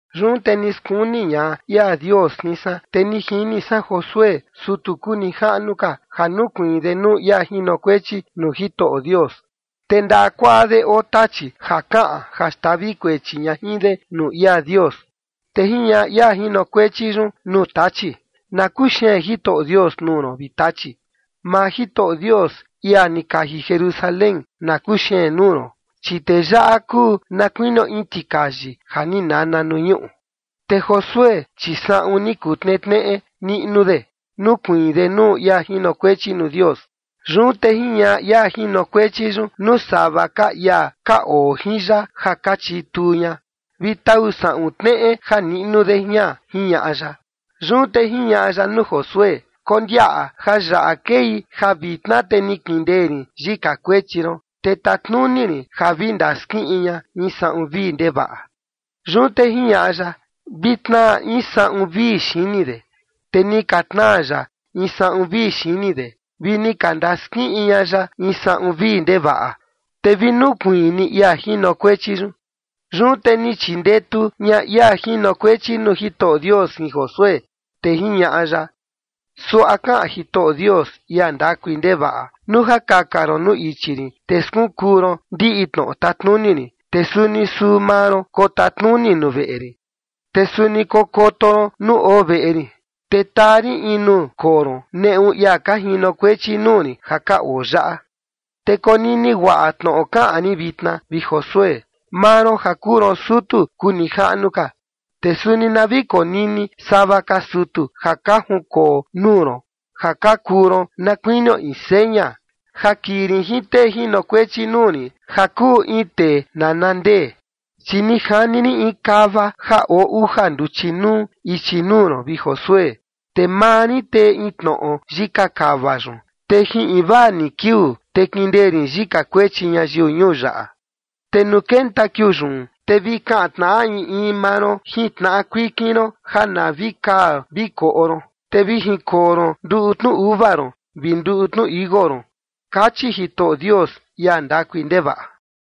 Yun te ni skuni ña ia Dios jin san, te ni jini san Josué, sutu kuu nijaꞌnu ka, ja nukuiin de nuu ia jinokuechi nuu Jitoꞌo Dios, te ndaꞌa kuaꞌa de oo Tachi ja kaꞌan ja xtavi kuechi ña jin de nuu ia Dios. Te jiñaꞌa ia jinokuechi yun nuu Tachi: “Na kuxeen Jitoꞌo Dios nuu ron, vi Tachi. Maa Jitoꞌo Dios, ia ni kaji Jerusalén, na kuxeen nuu ron, chi tee yaꞌa kuu na kuinio in tikayi ja ni nana nuu ñuꞌu”. Te Josué, chi saꞌun ni kuu tnetneꞌe niꞌnu de, nukuiin de nuu ia jinokuechi nuu Dios. Yun te jiñaꞌa ia jinokuechi yun nuu sava ka ia ka oo jin ya ja ka chituu ña: “Vi tau saꞌun tneꞌe ja niꞌnu de jian”, jiñaꞌa ya. Yun te jiñaꞌa ya nuu Josué: “Kondiaꞌa ja yaꞌa kei ja vitna te ni kindee rin yika kuechi ron, te tatnuni rin ja vi ndaskiꞌin ña in saꞌun vii ndevaꞌa”. Yun te jiñaꞌa ya: “Vi tnaa in saꞌun vii xini de”. Te ni ka tnaa ya in saꞌun vii xini de, vi ni ka ndaskiꞌin ña ya in saꞌun vii ndevaꞌa. Te vi nukuiin ni ia jinokuechi yun. Yun te ni chindetu ña ia jinokuechi nuu Jitoꞌo Dios jin Josué, te jiñaꞌa ya: “Suaꞌa kaꞌan Jitoꞌo Dios, ia ndakui ndevaꞌa: Nuu ja kaka ron nuu ichi rin, te skunkuu ron ndiꞌi tnoꞌo tatnuni rin, te suni suu maa ron kotatnuni nuu veꞌe rin, te suni kokoto ron nuu oo veꞌe rin, te taa rin in nuu koo ron neꞌu ia ka jinokuechi nuu rin ja ka oo yaꞌa. Te konini guaꞌa tnoꞌo kaꞌan rin vitna, vi Josué: Maa ron ja kuu ron sutu kuu nijaꞌnu ka, te suni na vi konini sava ka sutu ja ka junkoo nuu ron ja ka kuu ron na kuinio in seña: Ja kii rin jin tee jinokuechi nuu rin, ja kuu in tee nana ndee. Chi ni jani rin in kava ja oo uja nduchi nuu, ichi nuu ron, vi Josué, te maa rin tee in tnoꞌo yika kava yun, te jin invaa ni kiuu, te kindee rin yika kuechi ñayiu ñuu yaꞌa. Te nuu kenta kiuu yun, te vi kaꞌan tnaꞌa in in maa ron jin tnaꞌa kuikin ron ja na vi kaa vi koꞌo ron, te vi jinkoo ron nduꞌu tnu uva ron, vi nduꞌu tnu tichi iuu ron”, kachi Jitoꞌo Dios, ia ndakui ndevaꞌa.